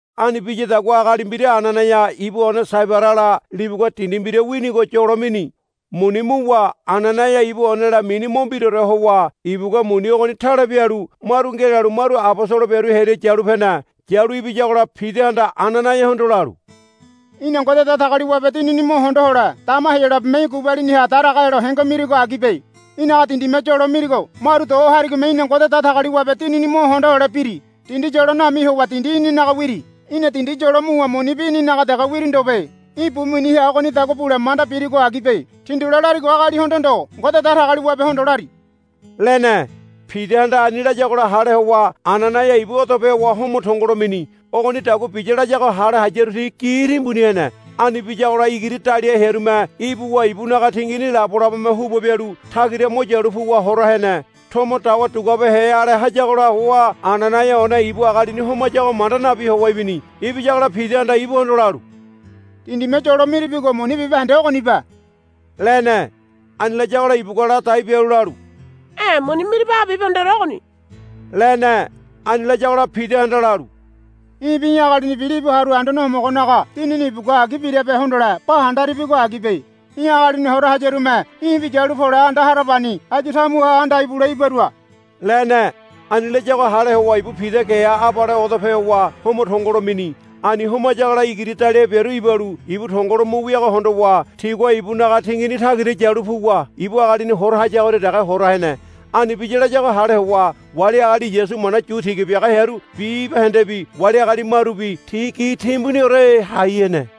Ani biyadagua agali mbira Ananaia ibu one Sabairala libugua dindi mbira winigo yolo mini. Muni muwa Ananaia ibu onela mini mo mbiraore howa ibugua muni ogoni tale bialu maru ngelalu maru abosolo biaru hearia yalu pene. Yalu ibiyagola Pidahanda Ananaiahondo lalu, Í̠na Ngode Datagaliwabe Dinini mo hondo hole dama Heyolabeme í̠ gubaliniha daraga helo henge mirigo agibe. Í̠naga dindime yolo mirigo maru do harigome í̠na Ngode Datagaliwabe Dinini mo hondo hole biri. Dindi yolo nami howa dindi í̠ninaga wiri. Í̠na dindi yolo muwa munibi í̠ninaga dege wiri ndobe. Í̠ bu miniha ogonidagua bule manda birigo agibe. Tindule larigo agalihondo ndo Ngode Datagaliwabehondo lari, lene. Pidahanda ani layagola hale howa Ananaia ibu odope howa homo tongolo mini. Ogonidagua biya layago hale hayaru ti gi timbuni hene. Ani biyagola igiri daliahe hearume ibuwa ibunaga tingini labolabome huba bialu tagira mo yalu puwa hora hene. Tomo dawa duguabehe ale hayagola howa Ananaia one ibu agalini homayago manda nabi howa ibini. Ibiyagola Pidahanda ibuhondo lalu, Dindime yolo miribigo muni bibahende ogonibe, lene. Ani layagola ibugua ladai bialu lalu, E̱ muni miribago bibahendeore ogoni, lene. Ani layagola Pidahanda lalu, Í̠bi í̠ agalinibi libu haru Anduane Homogonaga Dinini ibugua agi birabe hondole ba handaribigo agibe. Í̠ agalini hora hayarume í̠bi yalu pole anda harabani áyu tamuha anda ibule ibarua, lene. Ani layago hale howa ibu Pida geha abale odope howa homo tongolo mini. Ani homayagola igiri daliahe biaru ibalu ibu tongo lo mu wiago hondowa tigua ibunaga tingini tagira yalu puwa ibu agalini hora hayagoria dege hora hene. Ani biya layago hale howa wali agali Yasu mana yu tiga biaga hearu bibahendebi wali agali marubi ti gi timbuniore hai hene.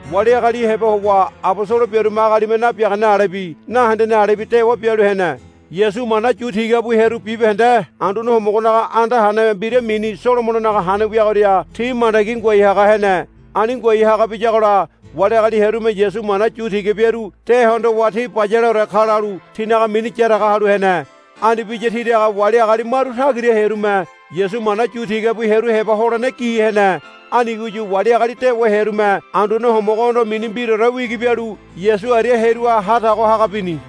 Wali agali heba howa abosolo biarume agalime nabiagane alebi nahendene alebi dewa bialu hene. Yasu mana yu tiga bu hearu bibahende Anduane Homogonaga anda hane mbira mini Solomononaga Hane wiagoria ti mandagi ngoai haga hene. Ani ngoai haga biyagola wali agali hearume Yasu mana yu tiga biaru de hondowa ti bayaleore ka lalu tinaga mini yaraga halu hene. Ani biya tiraga wali agali maru tagira hearume Yasu mana yu tiga bu hearu heba holene gi hene. Anigoyu wali agali dewa hearume Anduane Homogohondo mini mbiraore wigi bialu Yasu aria hearuha ha tago haga bini.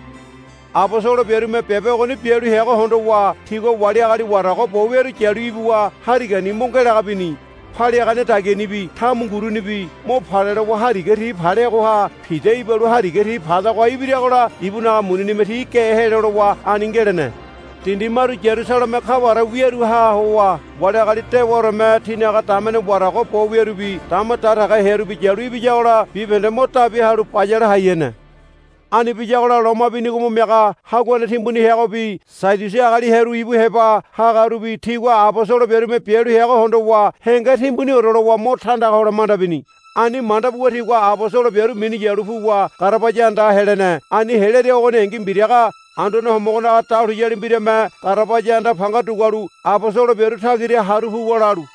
Abosolo biarume biabe ogoni bialu heago hondowa tigua wali agali warago bo wiaru yalu ibuwa harigani mo ngelaga bini. Paliagane dagianibi tamungurunibi mo pale lowa hariga ti paleagoha Pida ibalu hariga ti padagoha ibiragola ibunaga muninime ti ge helo lowa ani ngelene. Dindi maru Yarusaleme kaware wiaruha howa wali agali dewaoreme tinaga damene warago bo wiarubi dama daragahe hearubi yalu ibiyagola bibahende mo dabi halu bayale hai hene. Ani biyagola loma binigo mo miaga haguane timbuni heagobi Sadiusi agali hearu ibu heba hagarubi tigua abosolo biarume bialu heago hondowa henge timbuniore lowa mo tandaga hole manda bini. Ani manda buwa tigua abosolo biaru minu yalu puwa garabaya andaha helene. Ani helearia ogoningi mbiraga Anduane Homogonaga dahuliyali mbirame garabaya anda panga dugualu abosolo biaru tagira haru puwa lalu,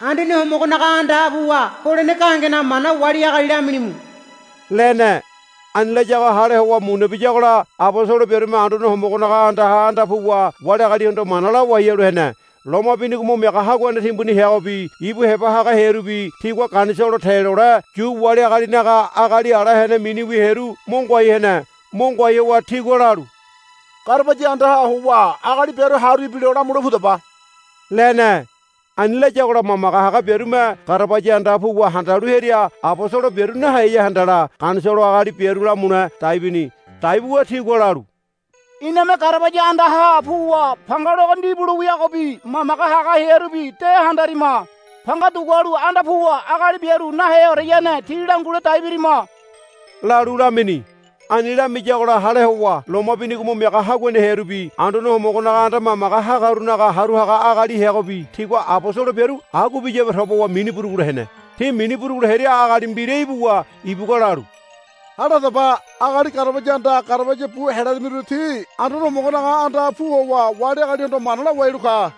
Anduane Homogonaga andaha puwa holene gahengenaga mana wali agali lamilimu, lene. Ani layago hale howa muna biyagola abosolo biarume Anduane Homogonaga andaha anda puwa wali agalihondo mana lawai halu hene. Loma binigo mo miaga haguane timbuni heagobi ibu heba haga hearubi tigua Ganisolo te lole Yu wali agalinaga agali ala hene miniwi hearu mo ngoai hene. Mo ngoai howa tigua lalu, Garabaya andaha howa agali biaru haru ibilo lamule pudaba, lene. Ani layagola mamage haga biarume garabaya andaha puwa handalu hearia abosolo biaru naheya handala Ganisolo agali biaru lamule dai bini. Dai buwa tigua lalu, Iname garabaya andaha puwa panga logo ndibu lo wiagobi mamage haga hearubi de handarima. Panga dugualu anda puwa agali biaru naheoreyane tí langule dai birima, lalu lamini. Ani lamiyagola hale howa loma binigo mo miaga haguane hearubi Anduane Homogonaga anda mamage hagarunaga haru haga agali heagobi tigua abosolo biaru agua biyabe toba howa mini burugulo hene. Ti mini burugulo hearia agali mbira ibuwa ibugua lalu, Hale hadaba. Agali garabaya andaha garabaya bu helarimiru ti Anduane Homogonaga andaha pu howa wali agalihondo mana lawai halu ka,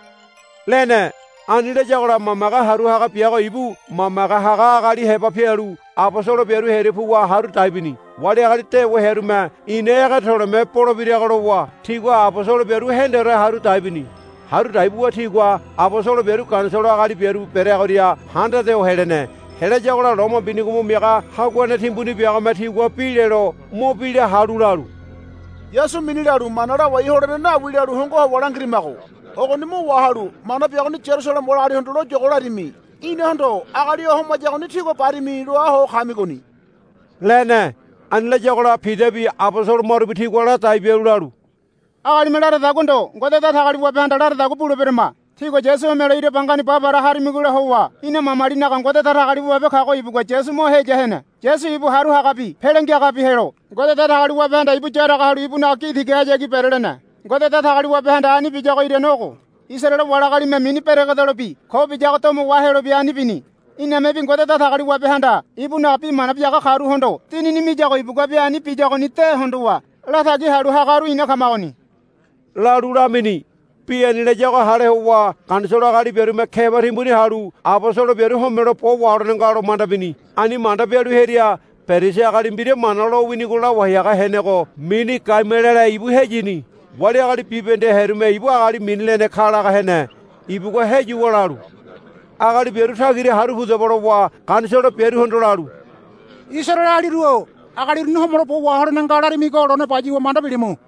lene. Ani layagola mamage haru haga biago ibu mamage haga agali heba pialu abosolo biaru hearia puwa haru dai bini. Wali agali dewa hearume ina ege to̱le̱me bolebirago lowa tigua abosolo biaru hendore haru dai bini. Haru dai buwa tigua abosolo biaru Ganisolo agali biaru bereagoria handade ho helene. Helayagola loma binigo mo miaga haguane timbuni biagome tigua bi lelo mo bi la halu lalu, Yasu mini lalu mana lawai holene nawi lalu hongo howa langirimago. Ogoni mo wahalu mana biagoni Yarusaleme wali agalihondo loyogo larimi. Inahondo, Agali o homayagoni tígua barimi, loa ho kamigoni, lene. Ani layagola Pidabi abosolo marubi tigua ladai bialu lalu, Agalime laradagua ndo Ngode Datagaliwabehanda laradagua buleberama. Tígua Yasu homelo ira bangani ba para harimigola howa ina mamalinaga Ngode Datagaliwabe kago ibugua Yasu mo heya hene. Yasu ibu Haru Hagabi Pele Ngiagabi helo Ngode Datagaliwabehanda ibu yaraga halu ibunaga gi tigahayagi berelene. Ngode Datagaliwabehanda ani biyago irane ogo. Isaraele wali agalime mini beregedelobi ko biyago domo wahelobi ani bini. Inamebi Ngode Datagaliwabehanda ibunaga bi mana biaga karuhondo Dinini miyago ibuguabi ani biyagoni de hondowa latagi halu hagaru ina kamagoni, lalu lamini. Bi ani layago hale howa Ganisolo agali biarume keba timbuni halu abosolo biaru homelo bo waholene nga lo manda bini. Ani manda bialu hearia Perisi agali mbira Mana lo winigo lawai haga henego mini Gamaliele ibu heyini. Wali agali bibahende hearume ibu agali mini lene ka laga hene. Ibugua heyuwa lalu, Agali biaru tagira haru pudaba, lowa Ganisolo biaruhondo lalu, Isaraelealiru-o agali uruni homelo bo waholene nga larimigo lone bayuwa manda bilimu.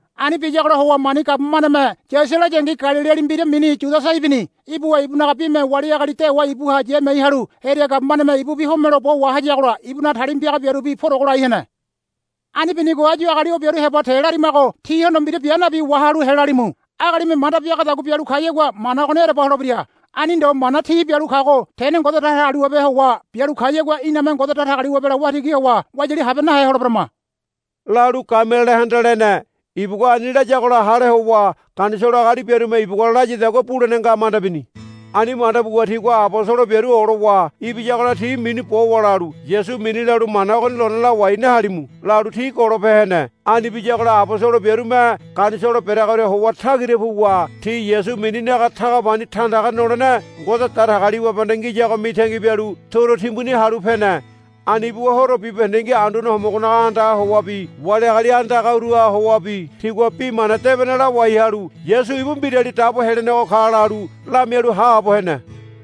Ani biyagola howa mani gabumaneme yasia layangi Galiliali mbira mini Yudasa ibini. Ibuwa ibunaga bime wali agali dewa ibuha yamiai halu hearia gabumaneme ibubi homelo bo wahayagola ibunaga talima piaga biarubi purogo lai hene. Ani binigo áyu agali o biaru heba te larimago tihondo mbira bia nabi wahalu helalimu. Agalime manda biagadagua bialu kayagua mana ogoni ereba holebira. Ani ndo mana ti bialu kago tene Ngode Datagaliwabe howa bialu kayagua iname Ngode Datagaliwabela waitigi howa wayali habe nahe holeberama, lalu Gamalielehanda lene. Ibugua ani layagola hale howa Ganisolo agali biarume ibugua layadagua bulene nga manda bini. Ani manda buwa tigua abosolo biaru olowa ibiyagola ti minu bowa lalu, Yasu mini lalu mana ogoni lone lawai nahalimu, lalu ti golope hene. Ani biyagola abosolo biarume Ganisolo bereagoria howa tagira puwa ti Yasu mininaga taga pani tandaga nolene Ngode Datagaliwabehanda ngiyago mitangi bialu turu timbuni halu pene. Ani buwa horo bibahendengi Anduane Homogonaga andaha howabi wali agali andagaruha howabi tigua Bi Mana Debene lawai halu, Yasu ibu Mbirali Dabo Helenego ka, lalu lamialu haabo hene.